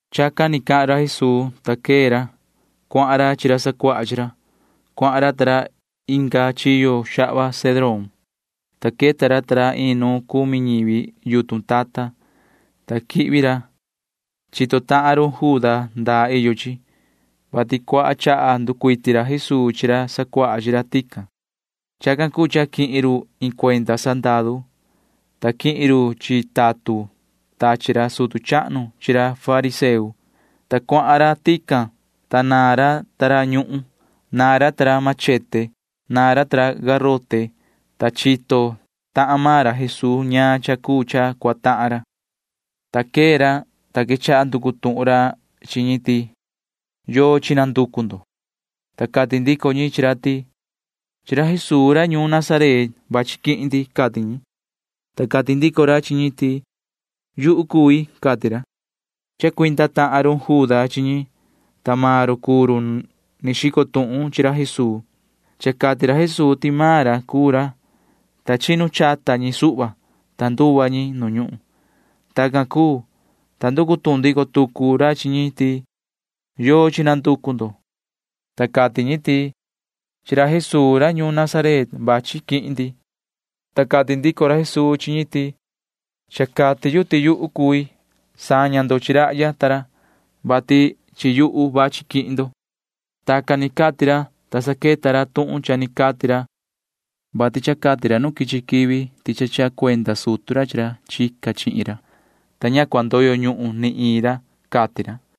Chacan ni cahan ra Jesuu, ta quee ra. Cuahan ra chi ra sacuaha chi ra. Cuahan ra ta ra inga chiyo xahva Cedrón, ta queta ra ta ra iin nu cumi ñivi yutun tata, ta quihvi ra. Chito tahan run Juda ndaa iyo chi, vati cuaha chaha nducuiti ra Jesuu chi ra sacuaha chi ra tican. Chacan cuu cha quihin run iin cuenda sandaru, ta quihin run chi tatun tachi ra sutu chahnu chi ra fariseo, ta cuahan ra tican, ta naan ra ta ra ñuhun. Naan ra ta ra espada. Naan ra ta ra garote. Naan ra. Tacan cuu, ta chito ra Jesuu ñaan cha cuu cha cua tahan ra, ta quee ra, ta quechaha nducu tuhun ra chi ñi ti: ―¿Yochi nanducu ndo? Ta cati ndico ñi chi ra ti: ―Chi ra Jesuu ra ñuun Nazaret vachi quihin ndi ―cati ñi. Ta cati ndico ra chi ñi ti: ―Yuhu cui ―cati ra. Chacuinda tahan run Juda chi ñi, ta maan run cuu run ni xico tuhun chi ra Jesuu. Cha cati ra Jesuu ti maan ra cuu ra, ta chinu chata ñi suhva, ta nduva ñi nu ñuhun. Tacan cuu, ta nducu tuhun ndico tucu ra chi ñi ti: ―¿Yochi nanducu ndo? Ta cati ñi ti: ―Chi ra Jesuu ra ñuun Nazaret vachi quihin ndi. Ta cati ndico ra Jesuu chi ñi ti: ―Cha cati yu ti yuhu cui. Na cua saña ndo chi rahya ta ra, vati chi yuhu vachi quihin ndo. Tacan ni cati ra, ta saqueta ra tuhun cha ni cati ra, vati cha cati ra nu quichi quivi ti cha chaha cuenda sutu ra chi ra chica chihin ra, ta ña cua ndoyo ñuhun ni iin ra, cati ra.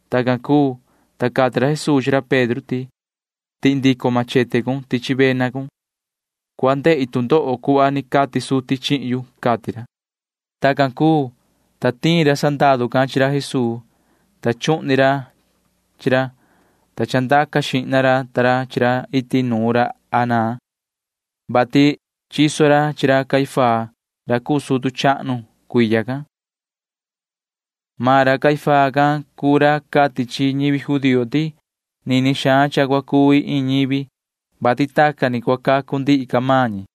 Tacan cuu, ta cati ra Jesuu chi ra Pedro ti: ―Tihi ndico machete cun tichi vena cun. Cua ndehi tu ndoho cuhva ni cati suti chihin yu ―cati ra. Tacan cuu, ta tiin ra sandaru can chi ra Jesuu, ta chuhni ra chi ra, ta chandaca xihna ra ta ra chi ra iti nuun ra Anaa, vati chiso ra chi ra Caifás ra cuu sutu chahnu cuiya can. Maan ra Caifás can cuu ra cati chi ñivi judío ti nini xaan cha cua cuvi iin ñivi, vati tacan ni cua cacu ndihi ca maan ñi.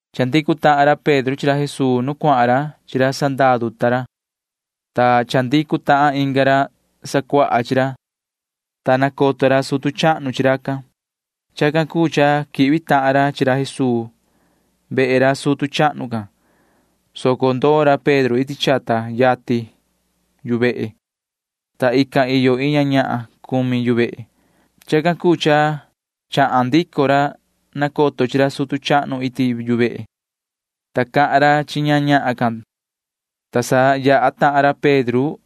Chandicu ra Pedro chi ra Jesuu nuun cuahan ra chi ra sandaru ta ra, ta chandicu tahan inga ra sacuaha chi ra, ta nacoto ra sutu chahnu chi racan. Chacan cuu cha quihvi tahan ra chi ra Jesuu tihyo ra sutu chahnu can, soco ndoo ra Pedro iti chata yatin yu vehe, vati iyo iin ñahan cumi yu vehe. Chacan cuu cha chahan ndico ra nacoto chi ra sutu chahnu iti yu vehe, ta cahan ra chi ña ñahan can, ta sa yaha tahan ra Pedro.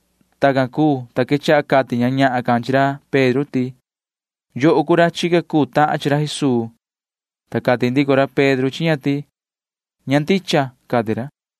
Tacan cuu, ta quechaha cati ña ñahan can chi ra Pedro ti: ―¿Atu ña ndicha ti chica tahun chi ra Jesuu? Ta cati ndico ra Pedro chi ña ti: ―Ña ndicha ―cati ra.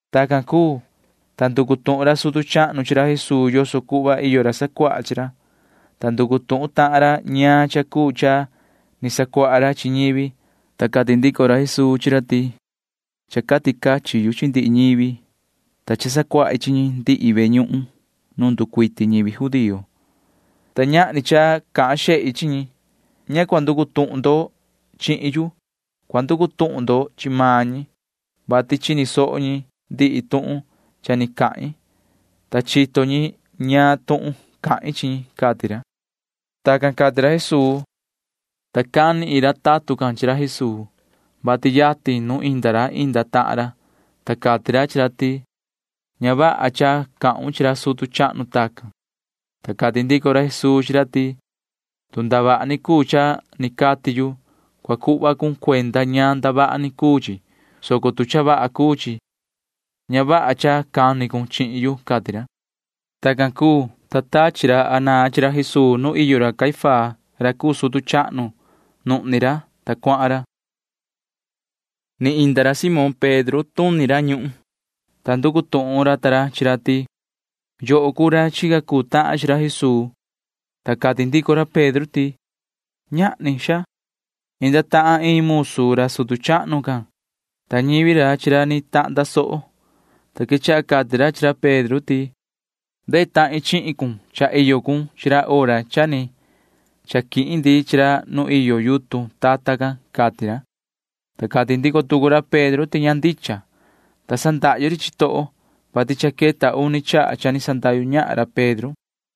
Tacan cuu, ta nducu tuhun ra sutu chahnu chi ra Jesuu yoso cuhva iyo ra sacuaha chi ra, ta nducu tuhun tahan ra ñaan cha cuu cha ni sacuaha ra chi ñivi, ta cati ndico ra Jesuu chi ra ti: ―Cha cati cachin yu chi ndihi ñivi, ta cha sacuahi chi ñi ndihi ve ñuhun nu nducuiti ñivi judío, ta ñahni cha cahan xehi chi ñi. Ña cua nducu tuhun ndo chihin yu. Cua nducu tuhun ndo chi maan ñi, vati chini soho ñi ndihi tuhun cha ni cahin, ta chito ñi ñaan tuhun cahin chi ñi ―cati ra. Tacan cati ra Jesuu, ta cani iin ra tatun can chi ra Jesuu, vati yatin nu inda ra inda tahan ra, ta cati ra chi ra ti: ―Ña vaha cha cahun chi ra sutu chahnu tacan. Ta cati ndico ra Jesuu chi ra ti: ―Tu ndavaha ni cuu cha ni cati yu, cua cuhvon cuenda ñaan ndavaha ni cuu chi, soco tu cha vaha cuu chi, ña vaha cha cani cun chihin yu ―cati ra. Tacan cuu, ta tachi ra Anaa chi ra Jesuu nu iyo ra Caifás ra cuu sutu chahnu, ta nuhni ra, ta cuahan ra. Ni inda ra Simón Pedro tuni ra ñuhun, ta nducu tuhun ra ta ra chi ra ti: ―¿Atu sacuahun chi ra Jesuu? Ta cati ndico ra Pedro ti: ―Ñahni, xaa. Inda tahan iin musu ra sutu chahnu can, ta ñivi ra chi ra ni tahnda soho, ta quechaha cati ra chi ra Pedro ti: ―Cha ndehi chihun, vati cha iyo cun chi ra hora cha ni chaquihin ndi chi ra nu iyo yutun tata can ―cati ra. Ta cati ndico tucu ra Pedro ti ña ndicha, ta sa ndahyu ri chitoho, [vati cha queta uni hora cha ni sandahyu ñahan ra Pedro].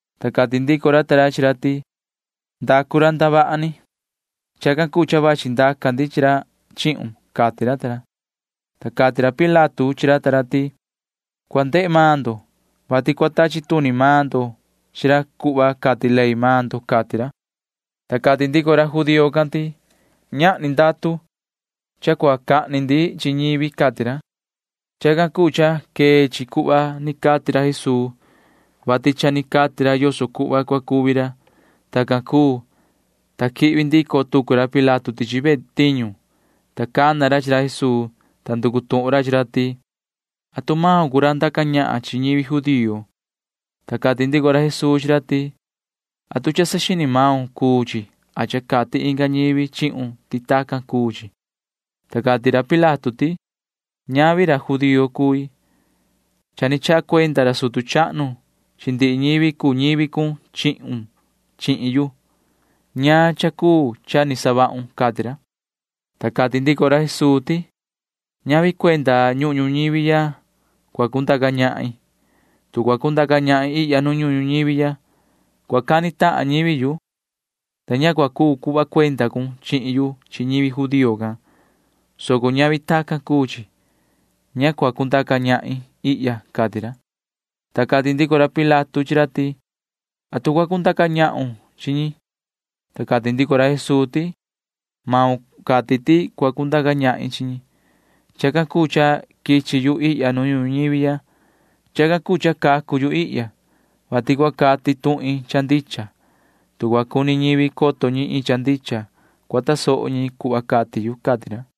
Ta cati ndico ra ta ra chi ra ti: ―Ndacu ra ndavaha ni. Chacan cuu cha vachi ndaca ndi chi ra chihun ―cati ra ta ra. Ta cati ra Pilato chi ra ta ra ti: ―Cua ndehe maan ndo, vati cua tachi tuni maan ndo chi ra cuhva cati ley maan ndo ―cati ra. Ta cati ndico ra judío can ti: ―Ñahni ndatu cha cua cahni ndi chi ñivi ―cati ra. Chacan cuu cha quee chi cuhva ni cati ra Jesuu, vati cha ni cati ra yoso cuhva cua cuvi ra. Tacan cuu, ta quihvi ndico tucu ra Pilato tichi ve tiñu, ta cana ra chi ra Jesuu, ta nducu tuhun ra chi ra ti: ―¿Atu maun cuu ra ndaca ñahan chi ñivi judío? Ta cati ndico ra Jesuu chi ra ti: ―¿Atu cha saxini maun cuu chi a cha cati inga ñivi chihun ti tacan cuu chi? Ta cati ra Pilato ti: ―Ñavi ra judío cui. Cha ni chaha cuenda ra sutu chahnu chi ndihi ñivi cuu ñivi cun chihun chihin yu. ¿Ñaan cha cuu cha ni savahun? ―cati ra. Ta cati ndico ra Jesuu ti: ―Ñavi cuenda ñuhun ñuñivi ya cua cundaca ñahin. Tu cua cundaca ñahin ihya nu ñuhun ñuñivi ya, cua cani tahan ñivi yu, ta ña cua cuu cuhva cuenda cun chihin yu chi ñivi judío can, soco ñavi tacan cuu chi. Ña cua cundaca ñahin ihya ―cati ra. Ta cati ndico ra Pilato chi ra ti: ―¿Atu cua cundaca ñahun chi ñi? Ta cati ndico ra Jesuu ti: ―Maun cati ti cua cundaca ñahin chi ñi. Chacan cuu cha quichi yu ihya nu ñuhun ñuñivi ya. Chacan cuu cha cacu yu ihya, vati cua cati tuhin cha ndicha. Tu cua cuni coto ñivi iin cha ndicha, cua tasoho ñi cuhva cati yu ―cati ra.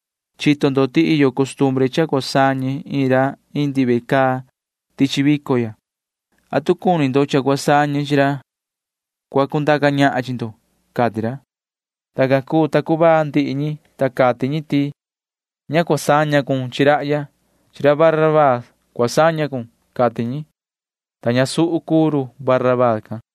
Chito ndo ti iyo costumbre cha cua sañe chi iin ra indi ve caa tichi vico ya. ¿Atu cuni ndo cha cua sañe chi ra cua cundaca ñahan chi ndo? ―cati ra. Tacan cuu, ta cuvaa ndihi ñi, ta cati ñi ti: ―Ña cua sañon chi rahya. Cua sañon chi ra Barabaa ―cati ñi, ta ñasuhu cuu ra Barabaa can.